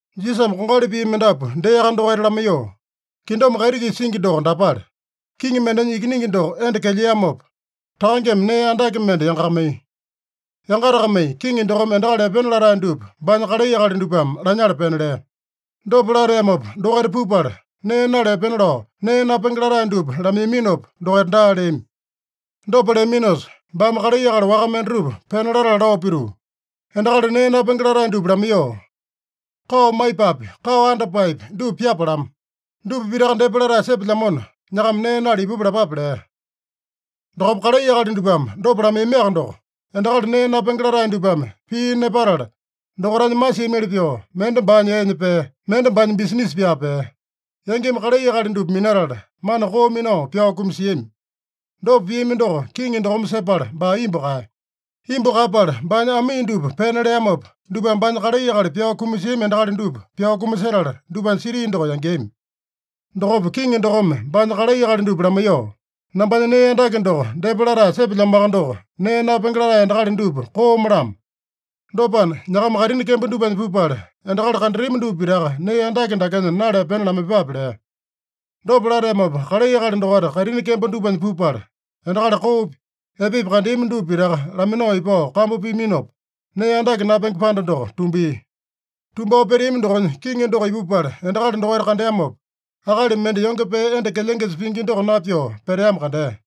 Jisasame kongali pii mendapu deaka dokaita lamaiyoo, “Kingdom kaiti-kisa singi doko dapale: Kiŋi mendenya ikiningi doko enda kelyeamopa, takangeme nee andake mende yangakamaiya. Yangatakamai kiŋi dokome endakali epena latae dupa baanya kalai akali dupame lanyala pena lea. Dopa lateamopa, dokaita pupala nee nala epena lao nee napenge latae dupa lamaiyaminopa, dokaita daa leami. Dopa leaminosa, baame kalai akali waka mendatupa pena latala lao pituu, ‘Endakali nee napenge latae dupa lamaiyoo, “Kao maipapi, kao andapaepi dupa pyapalamo. Dupa pitaka depa latae sepelyamona, nyakama nee nala ipupa” lapape’ lea. Dokopa kalai akali dupame dopa lamaiyamiaka doko, endakali nee napenge latae dupame pii nepatala, dokaitanya masiamili pyoo, mende baanya eenya pea, mende baanya bisinisa pyaa pea. Yangimi kalai akali dupa minatala, mana koo minao pyao kumasiami. Dopa piami doko kiŋi dokome sepala, baa imbu kaeya. Imbu kaeyapala baanya amii dupa pena leamopa, dupame baanya kalai akali pyao kumasiami endakali dupa pyao kumasetala, dupanya siti doko yangeami. Dokopa kiŋi dokome baanya kalai akali dupa lamaiyoo, ‘Nambanya nee andake doko depa latae sepelyamoaka doko, nee napenge latae endakali dupa kooma-lamo. Dopana, nyakama kaitini kembo dupanya pupala, endakali kandatami dupa pitaka nee andake dakenya nala epena lamaiyepape’ lea. Dopa lateamopa, kalai akali dokaita kaitini kembo dupanya pupala, endakali koopi, epepi kandeami dupa pitaka laminao ipao kambu piaminopa, nee andake napenge panda doko tumbia. “Tumbao peteami dokonya kiŋi doko ipupala endakali dokaita kandeamopa, akali mende yonge pee enda kelyengesa pingi doko napyoo peteamo kandea.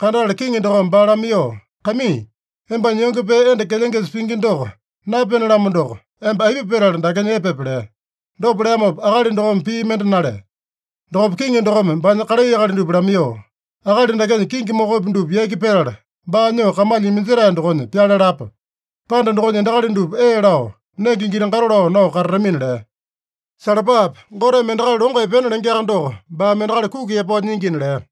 Kandatala kiŋi dokome baa lamaiyoo, ‘Kaimii, embanya yonge pee enda kelyengesa pingi doko napyene-lamo doko, emba aipa petala dakenya epepe?’ lea. Dopa leamopa akali dokome pii mende nalea. Dokopa kiŋi dokome baanya kalai akali dupa lamaiyoo, ‘Akali dakenya kingi mokopi dupa yaki petala, baa nyoo kamalya iminjetae dokonya pyale lapa. Panda dokonya endakali dupa ee lao, nenge giti-gato lao nao katatamina’ lea. Salapape! Goteme endakali longo epena lengeaka doko, baame endakali kuki yapao nyingina” lea.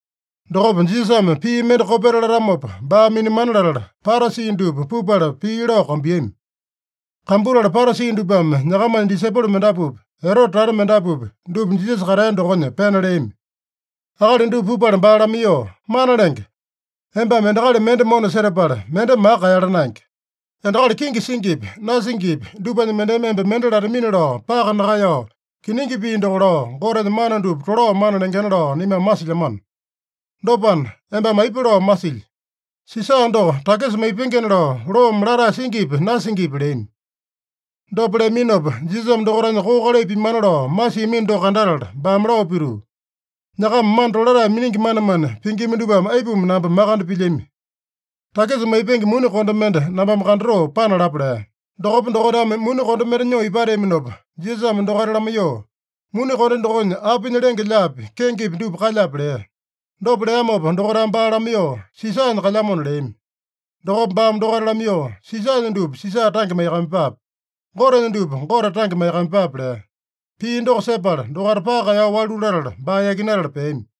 Dokopa Jisasame pii mende kopeta latamopa baa minamana latala, Parasi dupa pupala pii lao kambuiyami. Kambutala Parasi dupame nyakamanya disaipolo mendapupi, Erote tata mendapupi, dupa Jisasa katea dokonya pena leami. Akali dupa pupala baa lamaiyoo, “Mana Lenge, embame endakali mende mona setapala, mende maka kaeyala naenge. Endakali kenge singipi, nasingipi dupanya mendeme emba mende latamini-lao paka nakaeyao, kiningi pii doko lao, Gotenya mana dupa tolao mana lengena lao naimame masilyamano. Dopana, embame aipa lao masilyi? Sisa doko takisa maipengena lao loome latae singipi, nasingipi?” leami. Dopa leaminopa, Jisasame dokaitanya koo kalai pimana lao masiamino doko kandatala, baame lao pituu, “Nyakama mana tolatae miningi manemane pingima dupame aipuma namba makande pilyami? Takisa maipenge muni konde mende nambame kandatoo panalapa” lea. Dokopa dokaitame muni konde mende nyoo ipateaminopa, Jisasame dokaita lamaiyoo, “Muni konde dokonya apinya lenge-lyaapi, kengepi dupa kalyape?” lea. Dopa leamopa dokaitame baa lamaiyoo, “Sisanya kalyamona” leami. Dokopa baame dokaita lamaiyoo, “Sisanya dupa Sisa tange maiyakamaiyepape. Gotenya dupa Gote tange maiyakamaiyepape” lea. Pii doko sepala, dokaita paka kaeyao walu latala, baa yakinatala peami.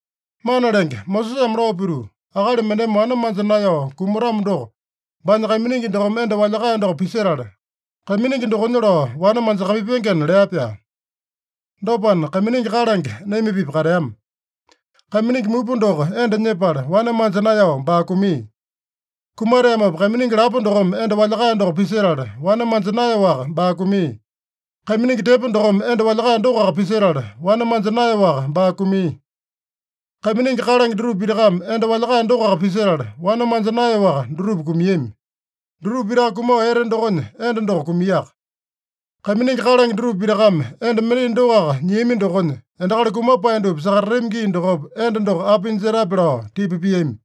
“Mana Lenge, Mosesame lao pituu, ‘Akali mendeme wane manja naeyao kumatamo doko, baanya kaiminingi dokome enda walyakae doko pisetala, kaiminingi dokonya lao wane manjakamaipengena’ lea-pyaa. Dopana, kaiminingi kalange naima-pipa kateama. Kaiminingi mupa doko enda nyepala, wane manja naeyao baa kumia. Kumateamopa, kaiminingi lapo dokome enda walyakae doko pisetala, wane manja naeyaowaka baa kumia. Kaiminingi tepo dokome enda walyakae dokoaka pisetala, wane manja naeyaowaka baa kumia. Kaiminingi kalange dutupa pitakame enda walyakae dokoaka pisetala, wane manja naeyaowaka dutupa kumiami. Dutupa pitaka kumao ete dokonya, enda doko kumiaka. Kaiminingi kalange dutupa pitakame enda mendai dokoaka nyiamino dokonya, endakali kumapae dupa sakatatami gii dokopa enda doko apinya jetape?” lao tipa piami.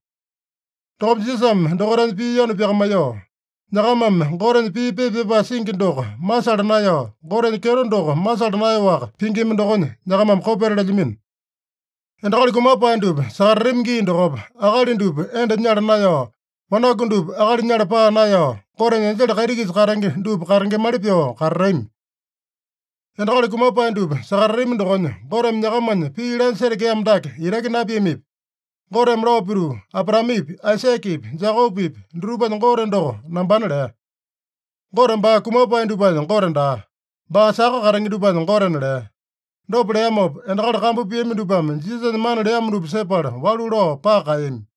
Dokopa Jisasame dokaitanya pii yanu pyakamaiyoo, “Nyakamame Gotenya pii pepa pyapae singi doko masala naeyao, Gotenya kyeto doko masala naeyaowaka pingima dokonya, nyakamame kopeta lelyamino. Endakali kumapae dupa sakatatami gii dokopa, akali dupa enda nyala naeyao, wanaku dupa akali nyala paa naeyao, Gotenya enjele kaiti-kisa katenge dupa katengemali pyoo katatami. Endakali kumapae dupa sakatatami dokonya, Goteme nyakamanya pii lanya setekeamo dake itaki napiamipi? Goteme lao pituu, ‘Abraamepi, Aisakepi, Jekopepi dutupanya Gote doko nambana’ lea. Gote baa kumapae dupanya Gote daa. Baa saka katenge dupanya Gotena” lea. Dopa leamopa, endakali kambu piami dupame Jisasanya mana leamo dupa sepala, walu lao paka kaeyami.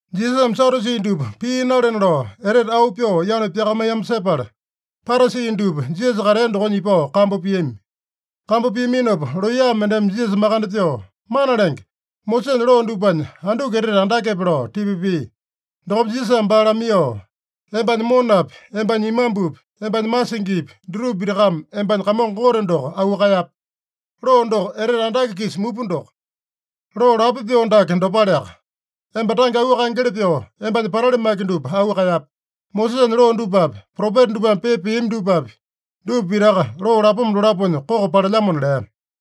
Jisasame Sadyusi dupa pii nalena lao, etete auu pyoo yanu pyakamaiyamo sepala, Parasi dupa Jisasa katea dokonya ipao kambu piami. Kambu piaminopa, looya mendeme Jisasa makande pyoo, “Mana Lenge, Mosesanya loo dupanya anduku etete andakepe?” lao tipa pia. Dokopa Jisasame baa lamaiyoo, “ ‘Embanya monapi, embanya imambupi, embanya masingipi, dutupa pitakame embanya Kamongo Gote doko auu kaeyape.’ Loo doko etete andake-kisa mupa doko. Loo lapo pyoo dake dopaleaka: ‘Emba tange auu kaengeli pyoo, embanya patali maki dupa auu kaeyape.’ Mosesanya loo dupapi, propeta dupame pepa piami dupapi, dupa pitaka loo lapoma dolaponya koko palelyamona” lea.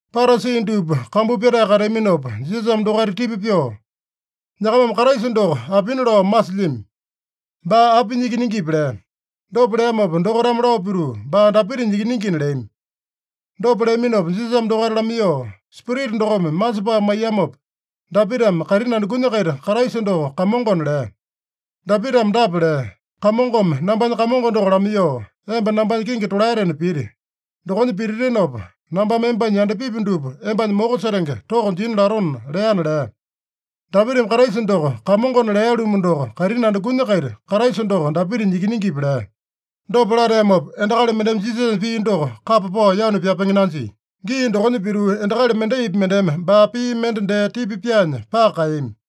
Parasi dupa kambu pyatae kateaminopa Jisasame dokaita tipa pyoo, “Nyakamame Kraisa doko apina lao masilyami? Baa apinya ikiningipi?” lea. Dopa leamopa dokaitame lao pituu, “Baa Dapitanya ikiningina” leami. Dopa leaminopa Jisasame dokaita lamaiyoo, “Spirita dokome masepae maiyamopa, Dapitame kaitini andukunya-kaita Kraisa doko Kamongona lea? Dapitame dapa lea: ‘Kamongome nambanya Kamongo doko lamaiyoo, “Emba nambanya kingi tolaetena piti. Dokonya pititinopa, nambame embanya yandapipi dupa embanya moko setenge toko jina latona” leana’ lea. Dapitame Kraisa doko Kamongona lea-lumu doko, kaitini andukunya-kaita Kraisa doko Dapitanya ikiningipi?” lea. Dopa lateamopa, endakali mendeme Jisasanya pii doko kapa pao yanu pyapenge nanjia. Gii dokonya pituu, endakali mendaipi mendeme baa pii mende dee tipa pyaanya paka kaeyami.